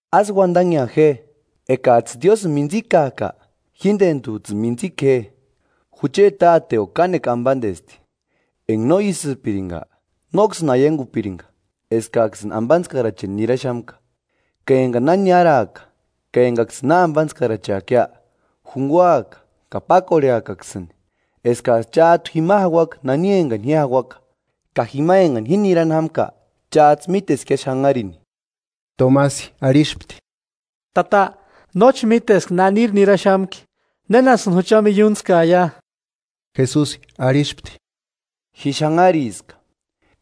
“Ásï uandanhea je, Ekajtsï Diósïni mintsikajka jíndentujtsïni mintsika je. Jucheti Táteo kánekua ambandesti; enga no ísïpiringa, nóksïni aiangupiringa eskaksïni ambantskaracheni niraxamka. Ka engani na niaraaka ka engaksïni na ambantskaracheakia, junguaka ka pákorheakaksïni, eskajtsï chájtu jima jauaka nani engani ji jauaka. Ka jima engani ji nirani jámka chájtsï míteskia xanharini.” Tomasi arhispti: –“Tata, nóchi míteska naniri niraxamki, ¿Nénasïni jucha miiuntskaia?” Jesusi arhispti: –Ji xanhariska,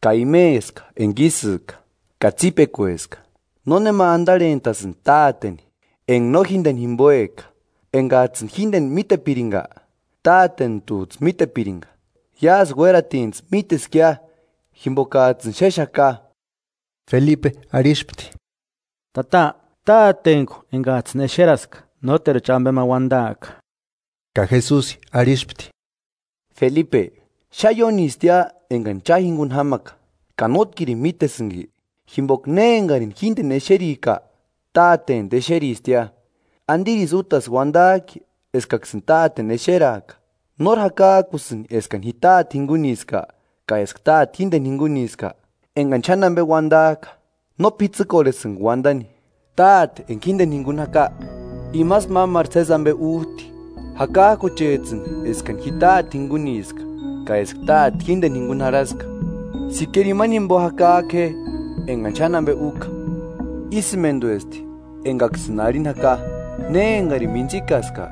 ka imeska enga ísïka, ka tsípekueska. Nónema andarhentasïndi táteni enga no jíndeni jimboejka. Engajtsïni jíndeni mítepiringa, Tátentujtsï mítepiringa; iásï uératintsï míteskia jimbokajtsï xéxaka. Felipe arhispti: –Tata, Tátentku engajtsïni exeraska, nóteruchi ambe ma uandaaka. Ka Jesusi arhispti: –Felipe, xáni iónistia engani cha jinguni jámaka ka ¿Nótkirini mítesïnki? Jimboka ne engarini jíndeni exerika, Tátentu exeristia; ¿Andirisï útasï uandajki eskaksïni Táteni exeraaka? ¿Nóri jakajkusïnki eskani ji Táte jinguniska ka eska Táte jíndeni jinguniska? Engani xáni ambe uandajka, no p'itsïkorhesïnga uandani; Táte enga jíndeni jinguni jaka imasï mámaru sési ambe újti. Jakajkuchejtsïni eskani ji Táte jinguniska, ka eska Táte jíndeni jinguni jarhaska. Sikera imani jimbo jakajku je engani xáni ambe úka. Ísïmenduesti engaksïni arhini jaka: Ne engarini mintsïkaska,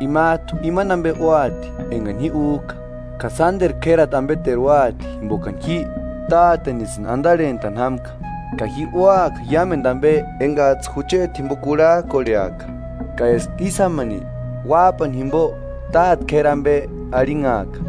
imajtu imani ambe úati engani ji újka, ka sánderu k'érati ambeteru úati jimbokani ji tátenisïni andarhentani jámka. Ka ji úaka iámendu ambe engajtsï jucheti jimbo kurhajkorheaka, ka eska ísï jámani Uájpani jimbo Táte k'éri ambe arhinhaaka.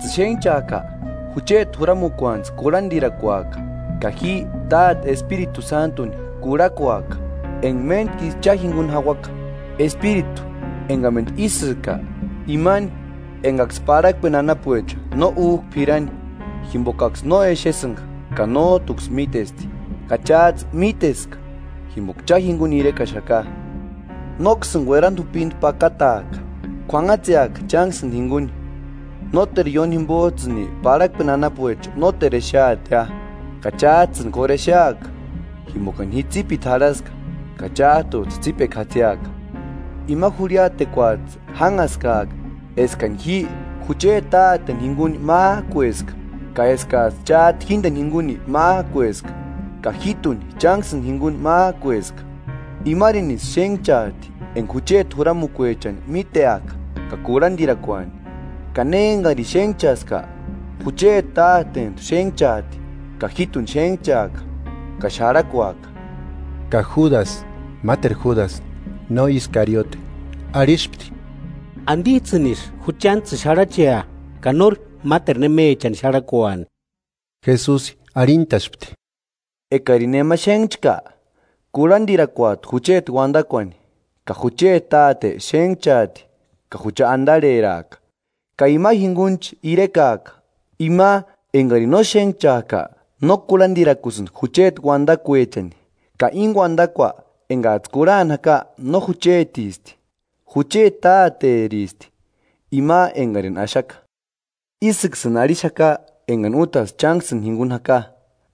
“Ekajtsïni xénhchajka, jucheti juramukuantsï kurhandirakuaka; ka ji Táteni Espiritu Sántuni kurhakuaka, enga méntkisï cha jinguni jauaka, Espiritu engamendu ísïka, imani engaksï parhakpeni anapuecha no újka p'irani jimbokaksï no exesïnga ka nójtuksï mítesti. Ka chájtsï míteska, jimboka cha jinguni irekaxaka.” “Nóksïni uerandi jupindi pakataaka: K'uanhatseaka chánksïni jinguni. Nóteru ióni jimbojtsïni parhakpeni anapuecha nóteru exeatia, ka chájtsïni k'óru exeaka, jimbokani ji tsípiti jarhaska ka chájtujtsï tsípekua jatsiaka. Ima jurhiatekuajtsï jánhaskaaka eskani ji jucheti Táteni jinguni májkueska ka eskajtsï chájtu jíndeni jinguni májkueska ka jíjtuni chánksïni jinguni májkueska. Imarinisï xénhchajti enga jucheti juramukuechani míteaka ka kurhandirakuani; ka ne engarini xénhchaska, jucheti tátejtu xénhchaati; ka jíjtuni xénhchaaka ka xarhakuaka.” Ka Júdasï (máteru Júdasï, no Iskariote) arhispti: –¿Andijtsïnisï juchantsïni xárhachea ka nóri máteru nemechani xarhakuani? Jesusi arhintaspti: “Ekarini nema xénhchka, kurhandirakuati jucheti uandakuani, ka jucheti Táte xénhchaati ka jucha andarheraaka, ka ima jingunichi irekaaka. Ima engarini no xénhchajka no kurhandirakusïndi jucheti undakuechani. Ka íni uadakua engajtsï kurhani jaka no juchetisti, jucheti Táteristi, ima engarini axaka. Ísïksïni arhixaka engani útasï chánksïni jinguni jaka.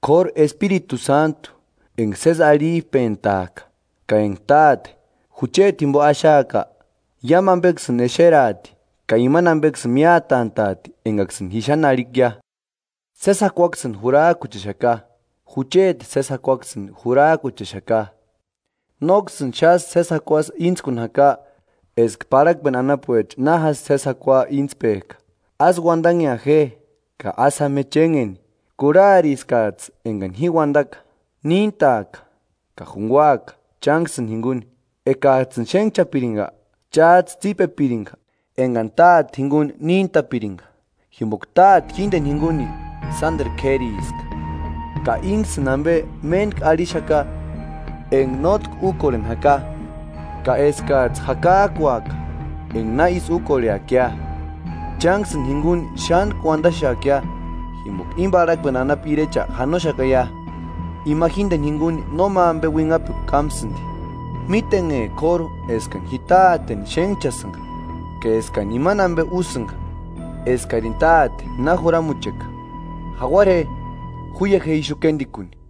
K'óru Espiritu Sántu, enga sési arhijpentajka, ka enga Táte, jucheti jimbo axaaka, iámu ambeksïni exeraati ka imani ambeksïni miátantaati engaksïni ji xáni arhikia. Sési jakuaksïni jurajkuchexaka; jucheti sési jakuaksïni jurajkuchexaka. Nóksïni xásï sési jakuasï íntskuni jaka eska parhakpeni anapuecha na jásï sési jakua íntspejka. Ásï uandanhea je ka ásï jáma je chénheni. Kurhariskajtsï engani ji uandaka: ‘Níntaaka ka junguaaka chánksïni jinguni.’ Ekajtsïni xénhchapiringa, chájtsï tsípepiringa engani Táte jinguni níntapiringa, jimboka Táte jíndeni jinguni sánderu k'ériska. Ka ínksïni ambe méntku arhixaka enga nótki úkorheni jaka, ka eskajtsï jakajkuaka enga na ísï úkorheakia. Chánksïni jinguni xántkuni uandaxeakia, jimboka íni parhakpeni anapu Irecha janoxakaia. Ima jíndeni jinguni nóma ambe uinhapekua kámsïndi; mítenhe k'óru eskani ji Táteni xénhchasïnga ka eskani imani ambe úsïnga eskarini Táte na juramucheka. Jauara je. Juia je ixu kéndikuni.”